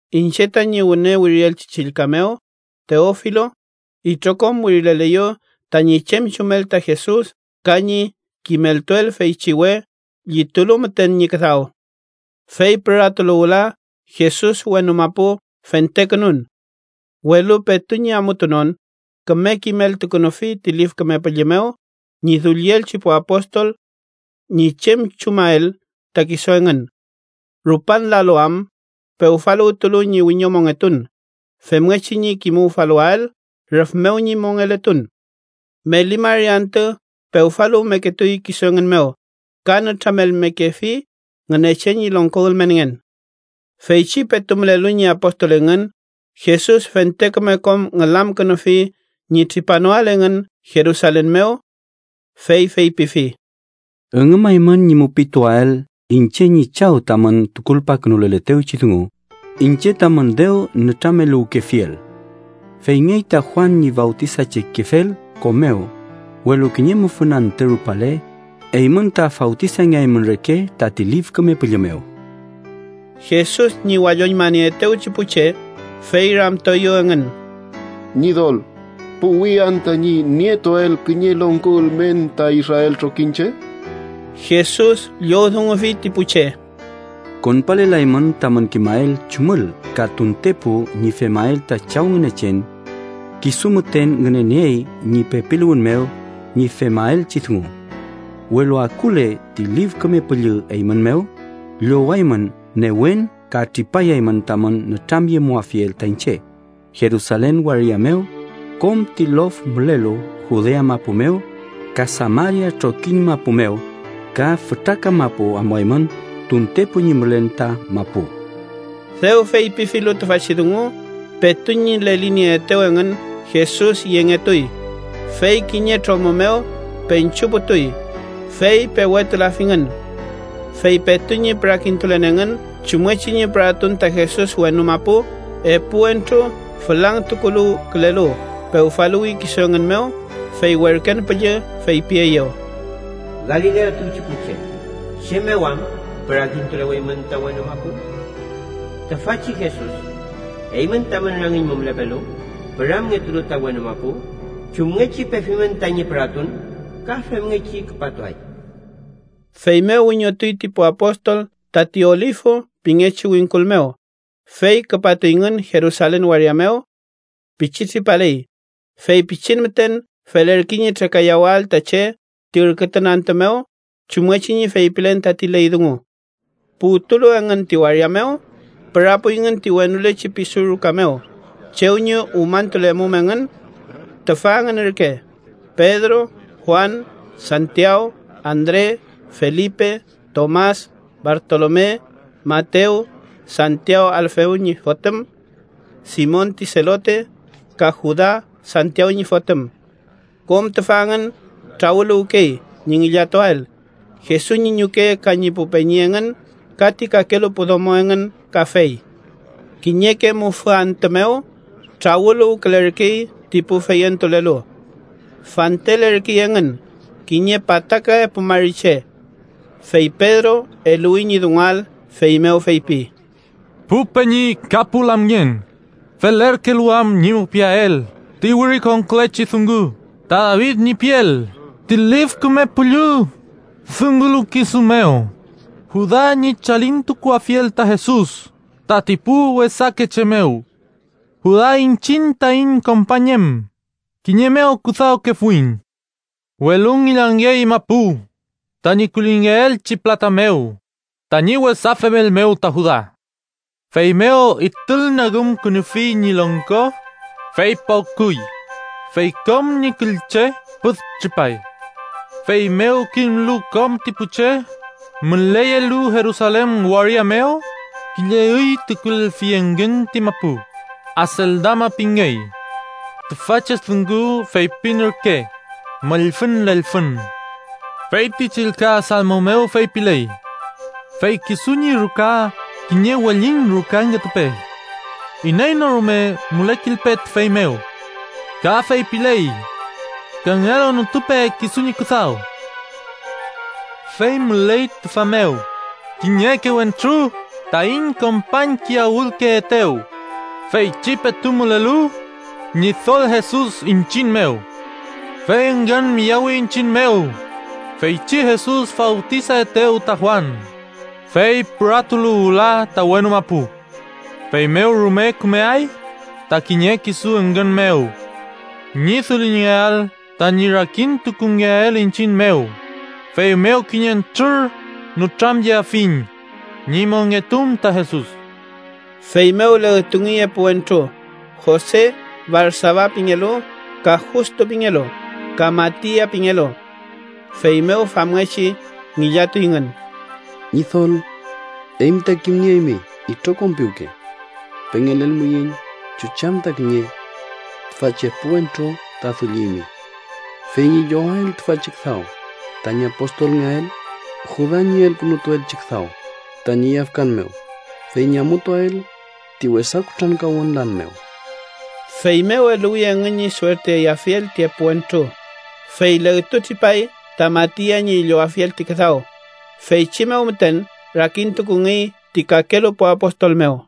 Iñche tañi wüne wirielchi chillka mew, Teofilo, itrokom wirileleyu tañi chem chumel ta Jesus ka ñi kimeltuel feychi we llitulu müten ñi küdaw. Fey püratulu wüla Jesus wenu mapu, fentekünun. Welu petu ñi amutunon, küme kimeltukünufi ti Lif Küme Püllü mew ñi dullielchi pu apostol ñi chem chumael ta kisu engün. Rupan lalu am pewfaluwtulu ñi wiñomongetun femngechi ñi kimuwfaluwael rüf mew ñi mongeletun. Meli mari antü pewfaluwmeketuy kisu engün mew ka nütramelmekefi Ngünechen ñi longko ülmenngen. Feychi petu mülelu ñi apostol engün, Jesus fente küme kom ngülamkünufi ñi tripanoael engün Jerusalen mew. Fey feypifi: —Üngümaymün ñi mupituael iñche ñi Chaw tamün tukulpakünuletewchi dungu, iñche tamün dew nütrameluwkefiel. Feyngey ta Juan ñi fawtisachekefel ko mew, welu kiñe mufün antü rupale, eymün ta fawtisangeaymün reke tati Lif Küme Püllü mew. Jesus ñi walloñmanieetewchi pu che, fey ramtueyew engün: —Ñidol, ¿puwi anta ñi nietuael kiñe longko ülmen ta israel trokiñche? Jesus llowdungufi ti pu che: —Konpalelaymün tamün kimael chumül ka tuntepu ñi femael ta Chaw Ngünechen. Kisu müten ngüneniey ñi pepiluwün mew ñi femaelchi dungu. Welu akule ti Lif Küme Püllü eymün mew, llowaymün newen ka tripayaymün tamün nütramyemuafiel ta iñche Jerusalen waria mew, kom ti lof mülelu Judea mapu mew, ka Samaria trokiñ mapu mew, ka fütra kamapu amuaymün tuntepu ñi mülen ta mapu. Dew feypifilu tüfachi dungu, petu ñi lelinieetew engün, Jesus yengetuy, fey kiñe tromü mew peñchuputuy, fey pewetulafingün. Fey petu ñi pürakintulen engün chumngechi ñi püratun ta Jesus wenu mapu, epu wentru fülangtukuluwkülelu pewfaluwi kisu engün mew. Fey werken püllü feypieyew: —Galilea tuwchi pu che, ¿chem mew am pürakintuleweymün ta wenu mapu? Tüfachi Jesus eymün tamün rangiñ mew mülepelu, püramngetulu ta wenu mapu, chumngechi pefimün tañi püratun, ka femngechi küpatuay. Feymew wiñotuy ti pu apostol tati Olifu pingechi wingkul mew, fey küpatuyngün Jerusalen waria mew. Pichi tripaley, fey pichin müten felerkey ñi trekayawael ta che ti ürkütun antü mew chumngechi ñi feypilen tati ley dungu. Puwtulu engün ti waria mew, pürapuyngün ti wenulechi pisu ruka mew chew ñi umañtulemum engün. Tüfa engün ürke Pedro, Juan, Santiaw, Andre, Felipe, Tomas, Bartolome, Matew, Santiaw Alfew ñi fotüm, Simon ti Selote, ka Juda Santiaw ñi fotüm. Kom tüfa engün trawüluwkey ñi ngillatuael, Jesus ñi ñuke ka ñi pu peñi engün ka ti kakelu pu domo engün kafey. Kiñeke mufü antü mew trawüluwkülerkey ti pu feyentulelu. Fantelerkey engün kiñe pataka epu mari che. Fey Pedro eluwi ñi dunguael, feymew feypi: “Pu peñi ka pu lamngen, felerkelu am ñi mupiael ti wirikonkülechi dungu ta David ñi piel ti Lif Küme Püllü dungulu kisu mew, Juda ñi chalintukuafiel ta Jesus tati pu wesake che mew. Juda iñchiñ taiñ kompañ em, kiñe mew küdawkefuiñ.” ( Welu ngillangey mapu tañi kullingepeelchi pülata mew, tañi wesa femel mew ta Juda. Feymew itulnagümkünufi ñi longko, fey pawküy, fey kom ñi küllche püdtripay. Feymew kimlu kom ti pu che müleyelu Jerusalen waria mew, kiñe üy tukulelfi engün ti mapu Aseldama pingey, tüfachi dungu feypin ürke “Mollfüñ Lelfün”.) “Fey ti chillka Salmo mew feypiley: ‘Fey kisu ñi ruka kiñe wellin rukangetupe. Iney no rume mülekilpe tüfey mew.’ Ka feypiley: ‘Kangelu nütupe kisu ñi küdaw.’ Fey müley tüfa mew kiñeke wentru taiñ kompañkiyawülkeetew, feychi petu mülelu Ñidol Jesus iñchiñ mew. Fey engün miyawi iñchiñ mew feychi Jesus fawtisaetew ta Juan, fey püratulu wüla ta wenu mapu. Feymew rume kümeay tati kiñe kisu engün mew ñi dullingeael tañi rakintukungeael iñchiñ mew, feymew kiñentrür nütramyeafiyiñ ñi wiñomongetun ta Jesus.” Feymew legtungey epu wentru: Jose, Barsaba pingelu (ka Justo pingelu), ka Matia pingelu. Feymew famngechi ngillatuyngün: “Ñidol, eymi ta kimnieymi itrokom piwke. Pengelelmuiñ chuchi am ta kiñe tüfachi epu wentru ta dullimi, fey ñi llowael tüfachi küdaw tañi apostolngeael Juda ñi elkünutuelchi küdaw tañi yafkan mew, fey ñi amutuael ti wesa kutrankawün lan mew.” Feymew eluwi engün ñi suertiayafiel ti epu wentru, fey legtutripay ta Matia ñi llowafiel ti küdaw. Feychi mew müten rakintukungey ti kakelu pu apostol mew.